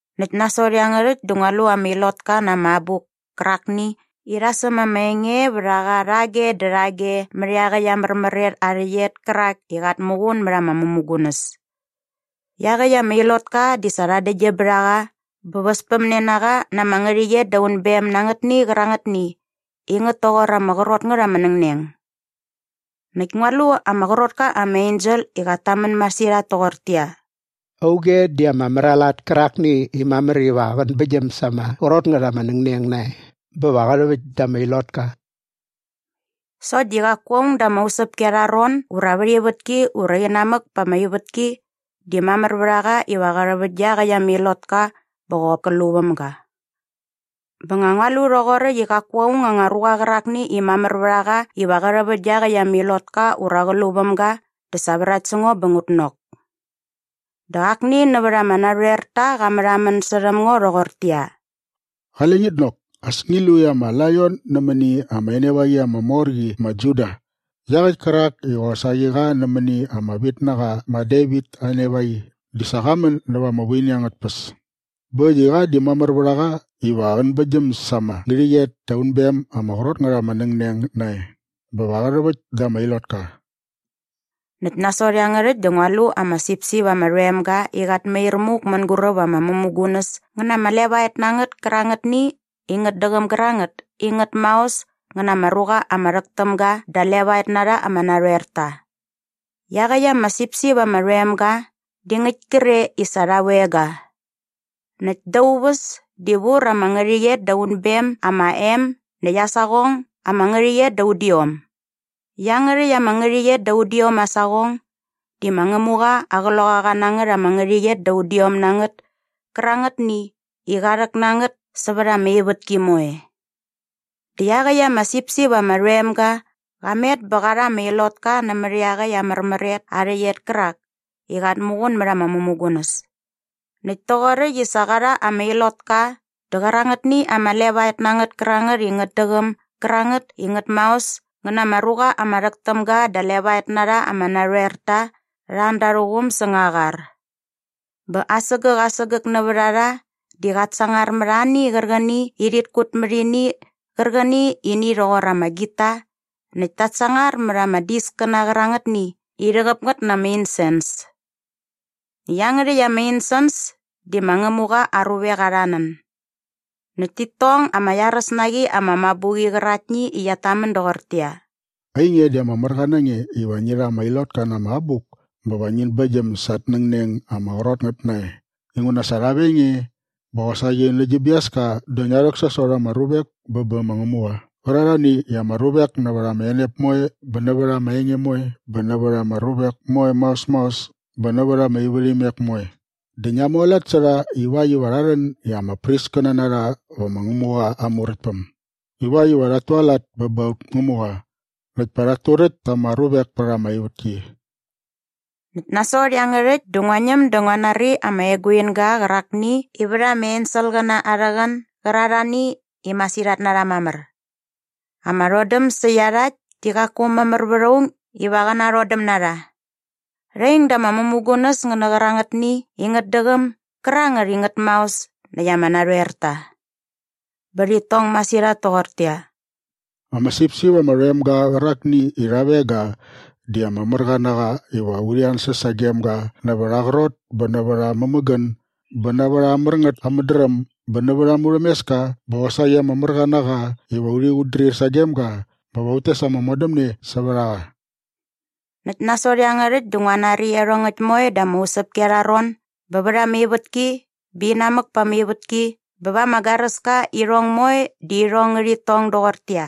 Näkt nasot iangärhäkt dä ngua lu ama ilotka na ama abuk kärakni i rha säm ama enge vät a qa rhage dä rhage mät iaqäkt aa märmär et aa rhäqyet kärak i qat muqun mät ama mämugunäs. Iaqäkt ama ilotka di sa rha däktgyäm bät a qa bä väspämne na qa na ama ngärhäqyet da unbem na angätni qärangätni i ngät toqor ama qrot ngät ama nängneng. Näkt ngua lu ama qrot ka ama ensel i qat tamän masirhat toqortäqyia, “Auge di ama mär aa lat kärakni i mamär iva qän bäktgyäm sa ama qrot ngät ama nängneng nae bä va qä rhäväkt da ama ilotka?” Sokt di qaku aung da ama usäpki arha ron ura vät ivätki ura inamäk pa ama ivätki di mamär vät a qa iva qä rhäväkt dä iaqäkt ama ilotka bä qop kä lu väm ga. Bä nga ngua lu rhoqoräkt i qaku aung anga ruqa qärakni i mamär vät a qa iva qä rhäväkt dä iaqäkt ama ilotka ura qä lu väm ga dä sa vrakt sä ngo bä ngut nok. Dä akni nävät ama narhoerta qa märhamän särhäm ngo rhoqortäqyia, “Qale ngit nok. As ngi lu i ama laion nämäni ama enevaqi ama mor qi ma Juda iaqäkt kärak i qosaqi qa nämäni ama vitnaqa ma Devit aa enevaqi di sa qa män nävä ama vuini angät tpäs bä äkt i qa di mamär vät a qa iva qän bäktgyäm sa ama ngärhäqyet da unbem ama qrot ngät ama nängneng nae bä va qä rhäväkt da ama ilotka.” Näkt nasot iangärhäkt dä ngua lu ama sipsip ama rhoem ga i qat mair muk mänguräp ama mämugunäs ngä na ama levaet na ngät kärangätni i ngät däqäm gärangät i ngät maos ngä na ama ruqa ama rhäk täm ga da levaet na rha ama narhoerta. Iaqäkt ama sipsip ama rhoem ga di ngäkt kre i sa rha veng ga. Näkt da aa uväs di vur ama ngärhäqyet da unbem ama em näkt aa saqong ama ngärhäqyet da udiom. Iangärhäkt aa ngärhäqyet da udiom aa saqong di ma Ngämuqa aa qloqaqanangät ama ngärhäqyet da udiom na ngät kärangätni i qa rhäk na ngät sävät ama ivätki moe. Dä iaqäkt ama sipsip ama rhoem ga qa met bä qa rha ama ilotka nämät iaqäkt aa märmär et aa rhäqyet kärak i qat muqun mät ama mämugunäs. Näkt toqoräkt i sa qa rha ama ilotka dä qärangätni ama levaet na ngät kärangät i ngät däqäm gärangät i ngät maos ngä na ama ruqa ama rhäk täm ga da levaet na rha ama narhoerta rha an da arhä quum säng aa qar. Bä asägäk asägäk nävät a rha di qat sangar mät ani qärqäni i rhit kut mät ini qärqäni i ini rhoqor ama gita näkt ta sangar mät ama diskäna qärangätni i rhäqäp ngät na ama insens. Näkt iangärhäkt ama insens di ma Ngämuqa aa ruvek arha nän. Näkt tit tong ama iaräs na qi ama mabuqi qäraktni i qiat tamän doqortäqyia, “Ainge di ama märqa na nge iva ngi rha ama ilotka na ama abuk bä va ngin bäktgyäm sa at nängneng ama qrot ngät nae inguna sa rha veng nge bä qosaqi nä gi biaska dä ngia rhäksasot ama ruvek bä bä ma Ngämuqa qärarhani i ama ruvek nävät ama enep moe bä nävät ama enge moe bä nävät ama ruvek moe maos maos bä nävät ama ivärhimek moe dä ngia mualat sä rha ivakt iva rha rhän i ama priskäna na rha vä ma Ngämuqa aa Muräktpäm ivakt iva rhat tualat bä ba aut Ngämuqa näkt pa rhat turäkt ta ama ruvek pät ama ivätki.” Näkt nasot iangärhäkt dä ngua ñäm dä ngua nari ama eguinga qärakni i vät ama enselqäna arhä qän gärarhani i masirhat na rha mamär. Ama rhodäm sä iarhakt di qaku mamär vät aung iva qä narhodäm na rha. Rha ing da ama mämugunäs ngä nä qärangätni i ngät däqäm gärangät i ngät maos näkt ama narhoerta. Bä rhit tong masirhat toqortäqyia, “Ama sipsip ama rhoem ga qärakni i rha veng ga di ama märqa na qa iva urhi ansäs sagem ga nävät aa qrot bä nävät aa mämägän bä nävät aa mär ngät aa mädräm bä nävät aa murhämeska bä qosaqi ama märqa na qa iva urhi qutdrir sagem ga bä va ut tes ama modämne sävät a qa!” Näkt nasot iangärhäkt dä ngua nari iarhongäkt moe da ama usäpki arha ron bä vät ama ivätki bä inamäk pa ama ivätki bä va ama garäska i iarhongäkt moe di irhong ngärhit tong doqortäqyia,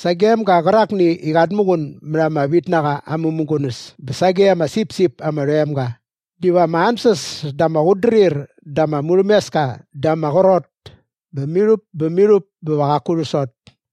“Sagem ga qärakni i qat muqun mät ama vitnaqa aa mämugunäs bä sage ama sipsip ama rhoem ga diva ama ansäs dä ama qutdrir dä ama murhämeska dä ama qrot bä mirhup bä mirhup bä va qaku rhäksot!”